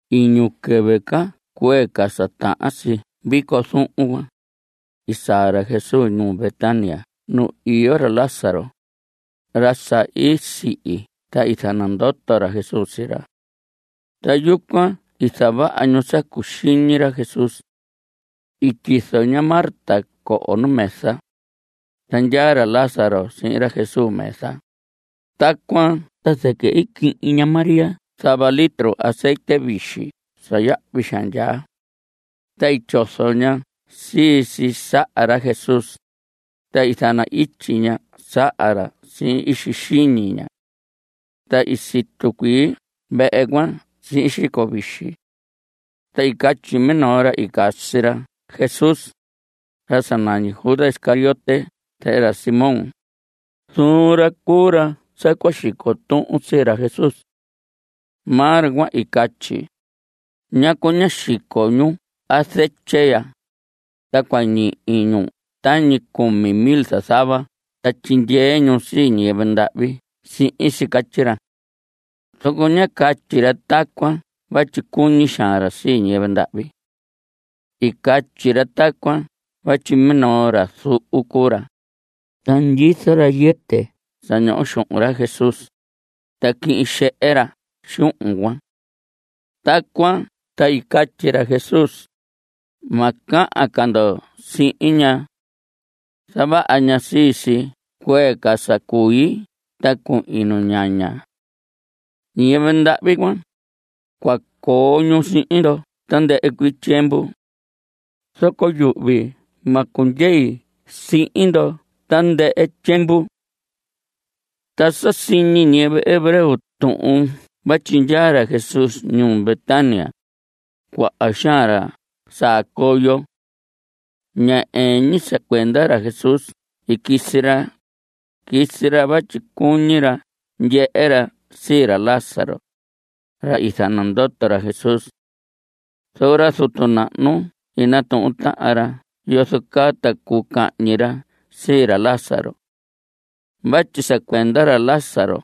Iñu quɨvɨ ca cuee ca sa tahan si vico zuhun cuan, i saa ra Jesús ñuu Betania nu iyo ra Lázaro, ra sa i sihi ta i zanandoto ra Jesús sii ra. Ta yucuan i zavaha ñu sa cuxiñi ra Jesús. I tyizo ña Marta coho nu mesa, ta ndyaa ra Lázaro sihin ra Jesús mesa. Tacuan ta zɨquɨ i quihin ña María zava litro azetye vixi sa yahvi xaan ndyaa, ta i tyozo ña sii si saha ra Jesús, ta i zana‑ityi ña saha ra sihin ixi xiñi ña. Ta i situ cuii vehe cuan sihin xico vixi. Ta i catyi minoo ra i casi ra Jesús, ra sa nañi Judas Iscariote zehe ra Simón, zuun ra cuu ra sa cua xico tuhun sii ra Jesús. Maa ra cuan i catyi: ¿Ñacu ñá xico ñu azetye ya? ta cua ñihi ñu tañi cumi mil zazava ta tyindyee ñu sii ñiyɨvɨ ndahvi sihin si. Catyi ra. Zoco ñá catyi ra tacuan vatyi cuñi xaan ra sii ñiyɨvɨ ndahvi. I catyi ra tacuan vatyi minoo ra zuhu cuu ra, ta ndyizo ra yɨtɨ sa ñoho xuhun ra Jesús, ta quihin xehe ra xuhun cuan. Tacuan ta i catyi ra Jesús: Ma cahan ca ndo sihin ña. Zavaha ña sii si cuee ca sa cui ta cuhin nuñaña. Ñiyɨvɨ ndahvi cuan, cua coo ñu sihin ndo tandɨhɨ cuii tyiemvu. Zoco yuhvi ma cundyei sihin ndo tandɨhɨ tyiemvu. Ta sa ñihi ñiyɨvɨ hebreo tuhun vatyi ndyaa ra Jesús ñuu Betania, cuaha xaan ra saa coyo. Ña ɨɨn ñi sa cuenda ra Jesús i quisi ra, quisi ra vatyi cuñi ra ndyehe ra sii ra Lázaro, ra i zanandoto ra Jesús. Zoco ra zutu nahnu i natuhun tahan ra yozo caa ta cuu cahñi ra sii ra Lázaro. Vatyi sa cuenda ra Lázaro,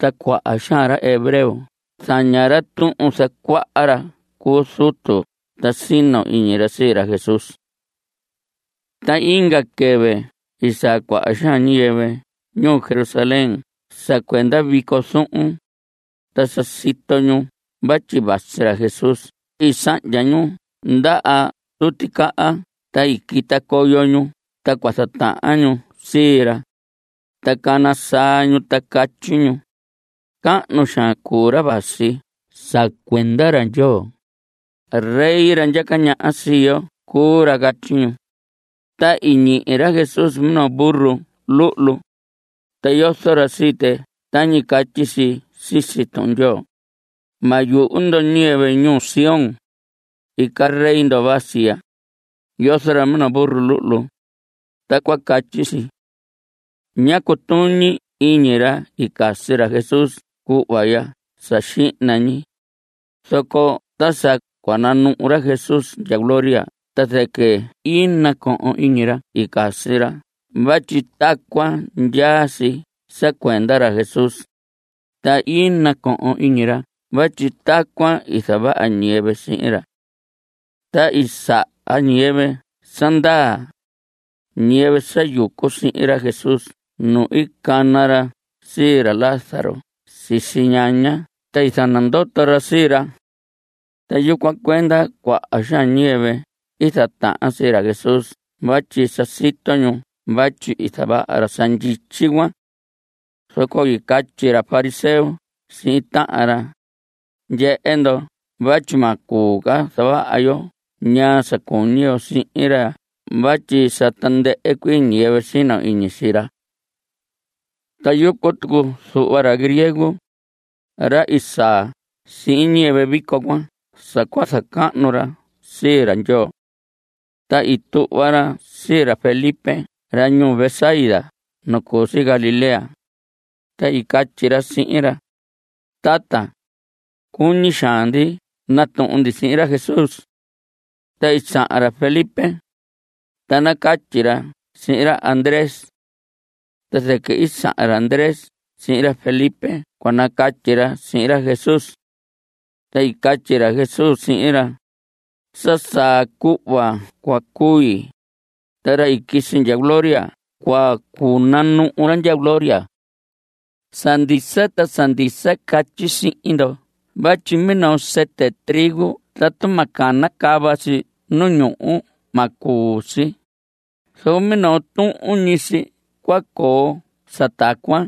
ta cuaha xaan ra hebreo zaña ra tuhun zacuaha ra cu zutu ta sino iñi ra sii ra Jesús. Ta inga quɨvɨ i saa cuaha xaan ñiyɨvɨ ñuu Jerusalén sa cuenda vico zuhun, ta sa i sito ñu vatyi vasi ra Jesús i sahndya ñu ndaha tuticaha ta i quita coyo ñu ta cua zatahan ñu sii ra, ta cana saa ñu ta catyi ñu: ¡Cahnu xaan cuu ra vasi sa cuenda ra Ndyoo! ¡Rey, ra ndyaca ñaha sii yo cuu ra! Catyi ñu. Ta i ñihi ra Jesús minoo burro luhlu, ta yozo ra sii tɨ tañi catyi si sisi Tuhun Ndyoo: Ma yuhu ndo ñiyɨvɨ ñuu Sión; Ica rey ndo vasi ya; Yozo ra minoo burro luhlu. Tacuan catyi si. Ña cutuñi iñi ra i casi ra Jesús cuhva ya sa xihna ñi, zoco ta sa cua nanuhu ra Jesús ndya gloria ta zɨquɨ i nacohon iñi ra i casi ra vatyi tacuan ndyaa si sa cuenda ra Jesús, ta i nacohon iñi ra vatyi tacuan i zavaha ñiyɨvɨ sihin ra. Ta i saha ñiyɨvɨ sa ndaa, ñiyɨvɨ sa yucu sihin ra Jesús nu i cana ra sii ra Lázaro sisi ñaña ta i zanandoto ra sii ra. Ta yucuan cuenda cuaha xaan ñiyɨvɨ i zatahan sii ra Jesús vatyi sa sito ñu vatyi i zavaha ra sa ndyityi cuan. Zoco i catyi ra fariseo sihin tahan ra: Ndyehe ndo vatyi ma cuu ca zavaha yo ñaa sa cuñi yo sihin ra vatyi sa tandɨhɨ cuii ñiyɨvɨ sino iñi sii ra. Ta yucu tucu zuhva ra griego, ra i saa sihin ñiyɨvɨ vico cuan sa cua zacahnu ra sii ra Ndyoo. Ta i tuhva ra sii ra Felipe ra ñuu Betsaida nu cu si Galilea, ta i catyi ra sihin ra: Tata, cuñi xaan ndi natuhun ndi sihin ra Jesús. Ta i sahan ra Felipe, ta nacatyi ra sihin ra Andrés. Ta zɨquɨ i sahan ra Andrés sihin ra Felipe cua nacatyi ra sihin ra Jesús. Ta i catyi ra Jesús sihin ra: Sa saa cuhva cua cui, ta ra i quisi ndya gloria cua cunanuhu ra ndya gloria. Sa ndisa ta sa ndisa catyi sihin ndo vatyi minoo sɨtɨ trigo tatu ma canacava si nu ñuhu ma cuu si, zoco minoo tuhun ñi si cua coo sa tacuan.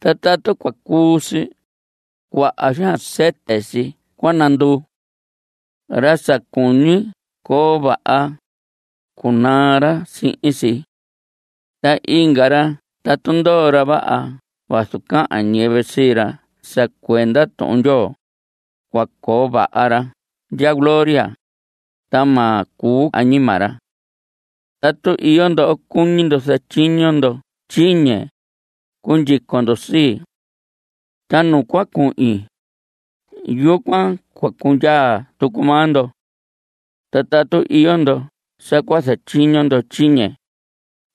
Ta tatu cua cuu si, cuaha xaan sɨtɨ si cua nanduu. Ra sa cuñi coo vaha, cunaa ra sihin si. Ta inga ra tatu ndoo ra vaha vazu cahan ñiyɨvɨ sii ra sa cuenda Tuhun Ndyoo, cua coo vaha ra cuan ndya gloria, ta ma cuu añima ra. Tatu iyo ndo cuñi ndo zatyiño ndo tyiñe, cundyico ndo sii. Ta nu cua cundyei, yucuan cua cundyaa tucu maa ndo. Ta tatu iyo ndo sa cua zatyiño ndo tyiñe,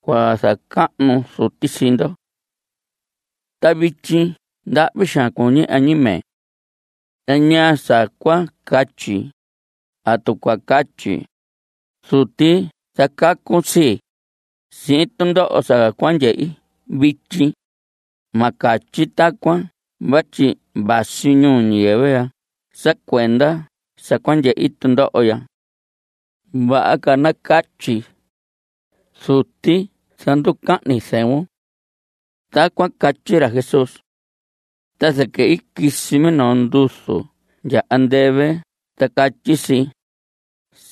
cua zacahnu Zuti sii ndo. Ta vityi ndahvi xaan cuñi añime. ¿Ta ñaa sa cua catyi? ¿Atu cua catyi: “Zuti zacacun sii, sihin tundoho sa cua ndyehi vityi”? Ma catyi tacuan vatyi vasi ñuu ñiyɨvɨ sa cuenda sa cua ndyehi tundoho ya. Vaha ca nacatyi: “Zuti zanducahnun zɨvun.” Tacuan i catyi ra Jesús. Ta zɨquɨ i quisi minoo nduzu ndya andɨvɨ ta catyi si: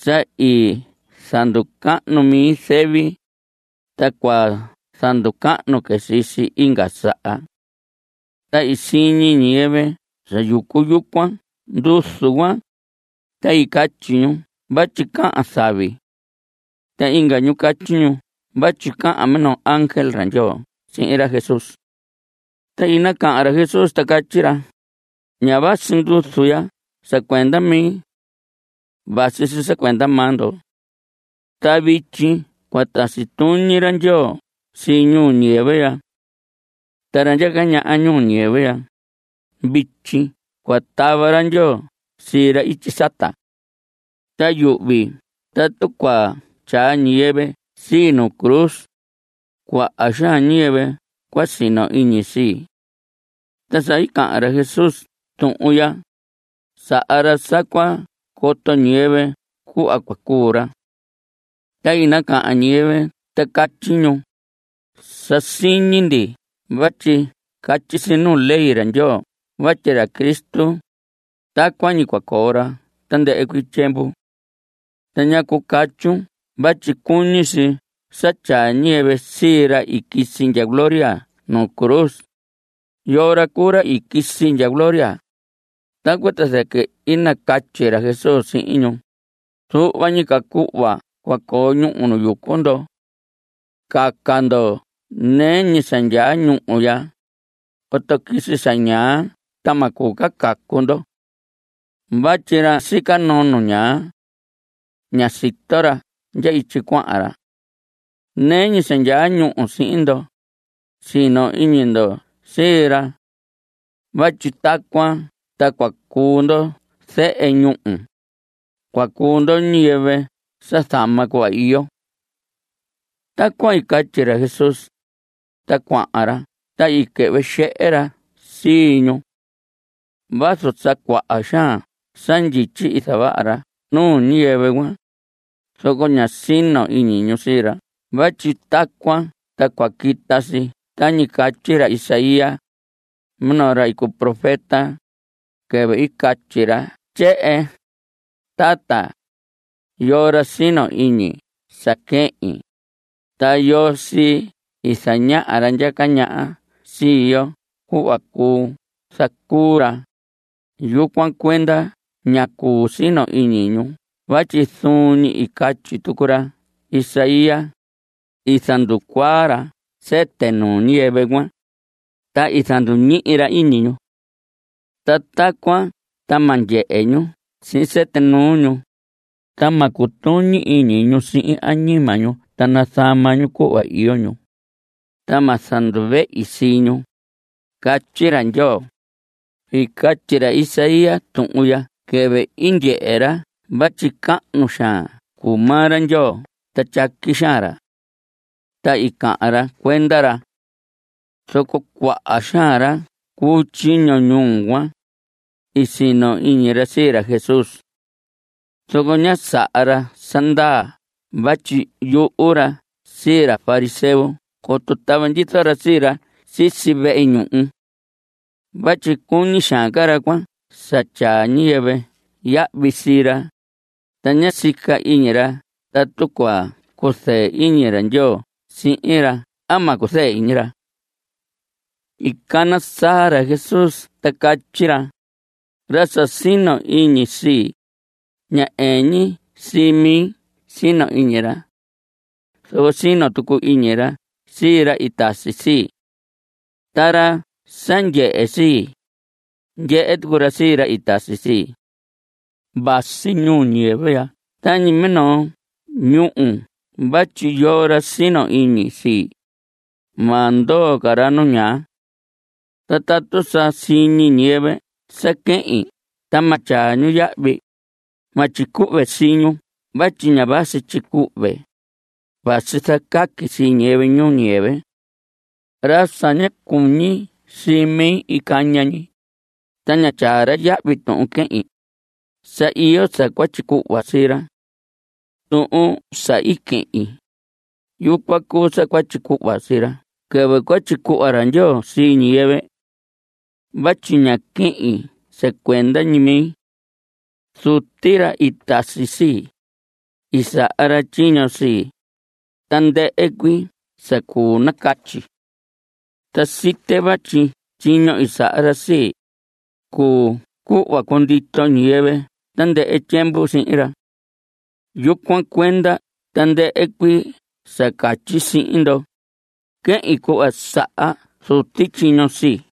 Sa i zanducahnu mi zɨvi, ta cua zanducahni sii si inga saha. Ta i siñi ñiyɨvɨ sa yucu yucuan nduzu cuan, ta i catyi ñu vatyi cahan zavi. Ta inga ñu i catyi ñu vatyi cahan minoo ángel ra Ndyoo sihin ra Jesús. Ta i nacahan ra Jesús ta catyi ra: Ña vasi nduzu ya sa cuenda mi. Vasi si sa cuenda maa ndo. Ta vityi cua tasi tuñi ra Ndyoo sii ñuu ñiyɨvɨ ya. Ta ra ndyaca ñaha sii ñuu ñiyɨvɨ ya, vityi cua tava ra Ndyoo sii ra ityi sata. Ta yuhvi tatu cua tyaa ñiyɨvɨ sii nu cruz, cuaha xaan ñiyɨvɨ cua sino iñi sii. Ta sa i cahan ra Jesús tuhun ya, saha ra sa cua coto ñiyɨvɨ cuhva cua cuu ra. Ta i nacahan ñiyɨvɨ ta catyi ñu: Sa siñi ndi vatyi catyi si nuu ley ra Ndyoo vatyi ra Cristo, tacuan ñi cua coo ra tandɨhɨ cuii tyiemvu. ¿Ta ñacu catyun vatyi cuñi si sa tyaa ñiyɨvɨ sii ra i quisi ndya gloria nu cruz? ¿Yoo ra cuu ra i quisi ndya gloria? Tacuan ta zɨquɨ i nacatyi ra Jesús sihin ñu: Zuhva ñi ca cuhva cua coo ñúhu nu yucu ndo. Caca ndo nɨɨ ñi sa ndyaa ñúhu ya, coto quisi sa ñaa ta ma cuu ca caca ndo. Vatyi ra sica noo nu ñaa, ña sito ra ndya ityi cuahan ra. Nɨɨ ñi sa ndyaa ñúhu sihin ndo, sino iñi ndo sii ra. Vatyi tacuan ta cua cuu ndo zehe ñúhu. (Cua cuu ndo ñiyɨvɨ sa zama cuhva iyo.) Tacuan i catyi ra Jesús, ta cuahan ra ta i quɨhvɨ xehe ra sii ñu. Vazu sa cuaha xaan sa ndyityi i zavaha ra nuu ñiyɨvɨ cuan, zoco ñá sino iñi ñu sii ra vatyi tacuan ta cua quita si tañi i catyi ra Isaías, minoo ra cu profeta, quɨvɨ i catyi ra tyehen: Tata ¿yoo ra sino iñi sa quehin? Ta ¿yoo sii i zañaha ra ndyaca ñaha sii yo cuhva cuu zacuu ra? Yucuan cuenda ña cuu sino iñi ñu vatyi zuun ñi i catyi tucu ra Isaías: I zanducuaa ra sɨtɨ nuu ñiyɨvɨ cuan, ta i zanduñihi ra iñi ñu. Ta tacuan ta ma ndyehe ñu sihin sɨtɨ nuu ñu, ta ma cutuñi iñi ñu sihin añima ñu ta nazama ñu cuhva iyo ñu, ta ma zanduvehi sii ñu. Catyi ra Ndyoo. I catyi ra Isaías tuhun ya quɨvɨ i ndyehe ra vatyi cahnu xaan cuu maa ra Ndyoo ta tyaqui xaan ra. Ta i cahan ra cuenda ra. Zoco cuaha xaan ra cu tyiño ñuu cuan, i sino iñi ra sii ra Jesús. Zoco ñá saha ra sa ndaa vatyi yuhu ra sii ra fariseo coto tava ndyizo ra sii ra sisi vehe ñuhu. Vatyi cuñi xaan ca ra cuan sa tyaa ñiyɨvɨ yahvi sii ra, ta ña sica iñi ra tatu cua cuzɨɨ iñi ra Ndyoo sihin ra a ma cuzɨɨ iñi ra. I cana saa ra Jesús ta catyi ra: Ra sa sino iñi sii, ña ɨɨn ñi sii mi sino iñi ra. Zoco sino tucu iñi ra sii ra i tasi sii. Ta ra sa ndyehe sii, ndyehe tucu ra sii ra i tasi sii. Vasi ñuu ñiyɨvɨ ya tañi minoo ñúhu vatyi yoo ra sino iñi sii, ma ndoo ca ra nu ñaa. Ta tatu sa siñi ñiyɨvɨ sa quehin ta ma tyaa ñu yahvi, ma tyicuhve sii ñu vatyi ña vasi tyicuhve. Vasi zacaqui sii ñiyɨvɨ ñuu ñiyɨvɨ. Ra sa ña cuñi sii mi caña ñi, ta ña tyaa ra yahvi tuhun quehin, sa iyo sa cua tyicuhva sii ra. Tuhun sa i quehin, yucuan cuu sa cua tyicuhva sii ra quɨvɨ cua tyicuhva ra Ndyoo sii ñiyɨvɨ. Vatyi ña quehin sa cuenda ñi mi. Zuti, ra i tasi sii, i saha ra tyiño sii, tandɨhɨ cuii sa cuu nacatyi. Ta site vatyi tyiño i saha ra sii, cuu cuhva cundito ñiyɨvɨ tandɨhɨ tyiemvu sihin ra. Yucuan cuenda tandɨhɨ cuii sa catyi sihin ndo, quehin cuhva saha Zuti tyiño sii.